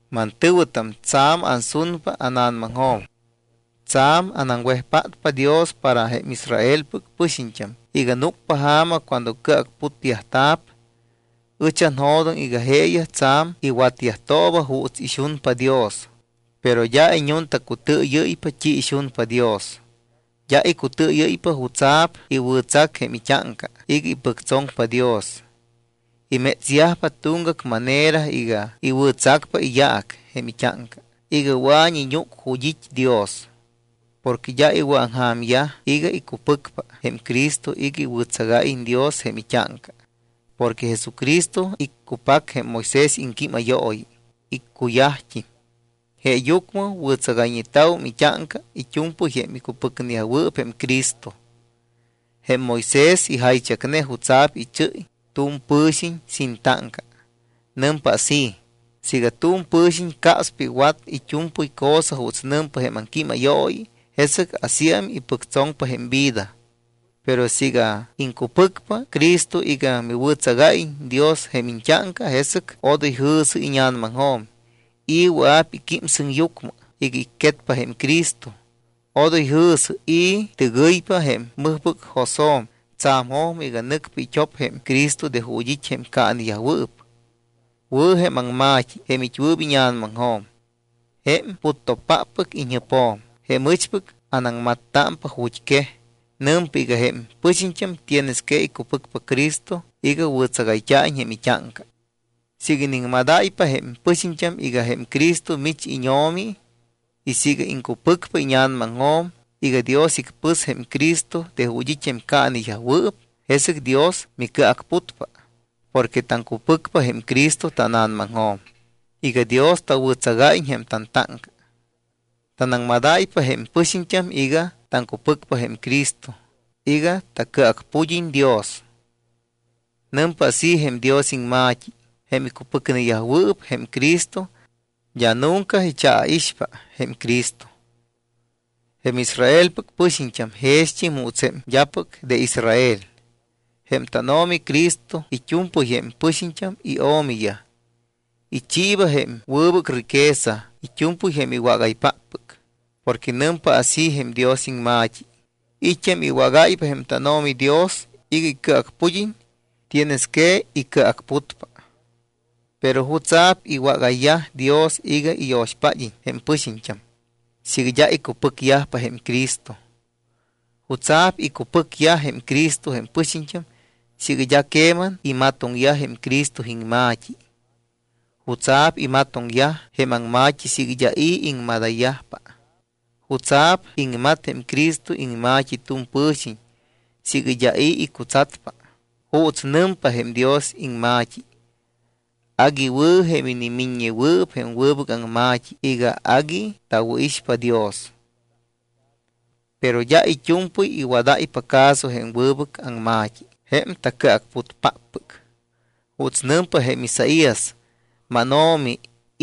Mantɨ̱wɨtam, tsa̱m ansunpa ána̱namaŋjo̱m, tsa̱m anaŋwejpátpa Dios para jém Israelpɨc pɨxiñt́am iga núcpa ja̱ma cuando cɨacputyajta̱p. Ɨch anjo̱doŋ iga jeeyaj tsa̱m iwatyajtooba juuts ixunpa Dios, pero d́a iñuntacutɨɨyɨ́ypa t́i ixunpa Dios. D́a icutɨɨyɨ́ypa jutsa̱p iwɨ̱tsac jém it́áŋca iga ipɨctsoŋpa Dios. Imétsyajpa tuŋgac manera iga iwɨ̱tsacpa iyaac jém it́áŋca iga wɨa̱iñ iñúc ju̱t́ it́ Dios. Porque d́a iwɨ̱aŋja̱myaj iga icupɨcpa jém Cristo iga iwɨ̱tsagáyiñ Dios jém it́áŋca. Porque Jesucristo iccupac jém Moisés iŋquímayooyi, iccuyajt́im. Jeeyucmɨ wɨ̱tsagayñeta̱wum it́áŋca it́u̱mpɨy jém icupɨcneyajwɨɨp jém Cristo. Jém Moisés ijaychacne jutsa̱p ichɨ́y tu̱m pɨ̱xiñ sin táŋca. Nɨmpa así: “Siiga tu̱m pɨ̱xiñ capspa iwat it́u̱mpɨy cosa juuts nɨmpa jém aŋquímayooyi, jesɨc asíam ipɨctsoŋpa jém vida.” Pero siiga iŋcupɨcpa Cristo iga miwɨ̱tsagáyiñ Dios jém iñt́áŋca, jesɨc odoy jɨ̱sɨ íña̱namaŋjo̱m: “¿I̱ wɨa̱p iquím sɨŋyucmɨ iga icquetpa jém Cristo?” Odoy jɨ̱sɨ: “¿I̱ tɨgɨypa jém mɨjpɨc josjo̱m tsa̱m jojmɨ iga nɨcpa it́op jém Cristo de ju̱t́ it́ jém caaneyajwɨɨp?” Wɨ̱ jém aŋma̱t́i, jém it́wɨɨp íña̱namaŋjo̱m, jém puttopáppɨc iñjɨpjo̱m, jém ɨchpɨc anaŋmattámpa ju̱t́ quej. Nɨmpa iga jém pɨxiñt́am tienes que icupɨcpa Cristo iga wɨ̱tsagayt́a̱iñ jém it́áŋca. Siiga iniŋmadáypa jém pɨxiñt́am iga jém Cristo mich íñO̱mi y siiga iŋcupɨcpa íña̱namaŋjo̱m iga Dios icpɨs jém Cristo de ju̱t́ it́ jém caaneyajwɨɨp, jesɨc Dios micɨacputpa. Porque taŋcupɨcpa jém Cristo tána̱namaŋjo̱m iga Dios tawɨ̱tsagáyiñ jém tantáŋca. Tanaŋmadáypa jém pɨxiñt́am iga taŋcupɨcpa jém Cristo iga tacɨacpud́iñ Dios. Nɨmpa así jém Dios iŋma̱t́i: “Jém icupɨcneyajwɨɨp jém Cristo d́a nunca ichaaixpa jém Cristo.” Jém Israelpɨc pɨxiñt́am jext́im juuts jém d́apɨc de Israel. Jém tánO̱mi Cristo it́u̱mpɨy jém pɨxiñt́am iO̱miyaj. Ichiiba jém wɨbɨc riqueza it́u̱mpɨy jém iwágaypáppɨc. Porque nɨmpa así jém Dios iŋma̱t́i: “I̱t́am iwágáypa jém tánO̱mi Dios iga icɨacpud́iñ, tienes que icɨacputpa.” ¿Pero jutsa̱p iwágayyaj Dios iga iyo̱xpád́iñ jém pɨxiñt́am, siiga d́a icupɨcyajpa jém Cristo? ¿Jutsa̱p icupɨcyaj jém Cristo jém pɨxiñt́am siiga d́a queman imatoŋyaj jém Cristo iŋma̱t́i? ¿Jutsa̱p imatoŋyaj jém aŋma̱t́i siiga d́a i̱ iŋmadayyajpa? ¿Jutsa̱p iŋmat jém Cristo iŋma̱t́i tu̱m pɨ̱xiñ siiga d́a i̱ icutsatpa? Juuts nɨmpa jém Dios iŋma̱t́i: “Agui wɨ̱ jém inimiññewɨɨp jém wɨbɨc aŋma̱t́i iga agui tawɨ̱ixpa Dios.” Pero d́a it́u̱mpɨy iwadáypa caso jém wɨbɨc aŋma̱t́i jém tacɨacputpáppɨc. Juuts nɨmpa jém Isaías: “¿MánO̱mi,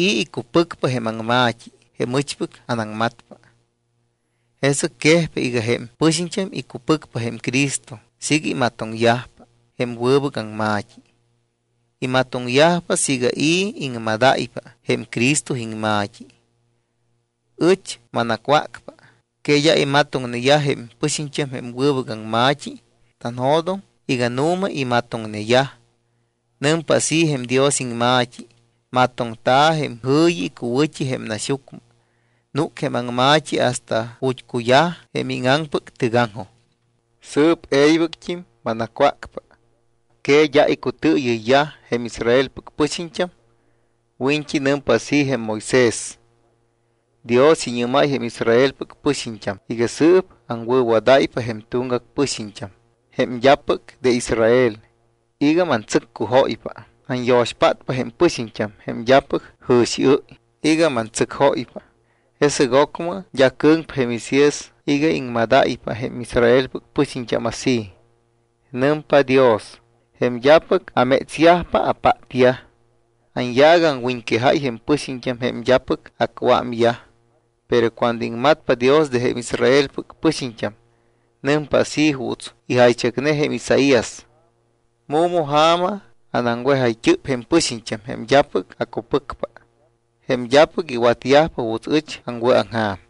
i̱ icupɨcpa jém aŋma̱t́i jém ɨchpɨc anaŋmatpa?” Jesɨc quejpa iga jém pɨxiñt́am icupɨcpa jém Cristo siiga imatoŋyajpa jém wɨbɨc aŋma̱t́i. Imatoŋyajpa siiga i̱ iŋmadáypa jém Cristo iŋma̱t́i. Ɨch manacwácpa. ¿Que d́a imatoŋneyaj jém pɨxiñt́am jém wɨbɨc aŋma̱t́i? Tanjo̱doŋ iga nu̱ma imatoŋneyaj. Nɨmpa así jém Dios iŋma̱t́i: Matoŋta̱ jém jɨ̱yi icuwɨ̱t́i jém naxyucmɨ. Núc jém aŋma̱t́i hasta ju̱t́ cuyaj jém íŋaŋpɨc tɨgaŋjoj. Sɨɨp e̱ybɨct́im manacwácpa. ¿Que d́a icutɨɨyɨyyaj jém Israelpɨc pɨxiñt́am? Wiñt́i nɨmpa así jém Moisés: Dios iñɨ́máy jém Israelpɨc pɨxiñt́am iga: “Sɨɨp aŋwɨ̱wadáypa jém tuŋgac pɨxiñt́am jém d́apɨc de Israel iga mantsɨccujóypa. Anyo̱xpátpa jém pɨxiñt́am jém d́apɨc jɨ̱xiɨ́y iga mantsɨcjóypa.” Jesɨc ocmɨ d́a cɨ̱ŋpa jém Isaías iga iŋmadáypa jém Israelpɨc pɨxiñt́am así: Nɨmpa Dios: “Jém d́apɨc amétsyajpa, apátyaj. Anyaac aŋwiñquejáy jém pɨxiñt́am jém d́apɨc acuámyaj.” Pero cuando iŋmatpa Dios de jém Israelpɨc pɨxiñt́am, nɨmpa así juuts ijaychacne jém Isaías: “Mu̱ma ja̱ma anaŋwejayt́ɨp jém pɨxiñt́am, jém d́apɨc acupɨcpa, jém d́apɨc iwatyajpa juuts ɨch aŋwɨ̱aŋja̱m.”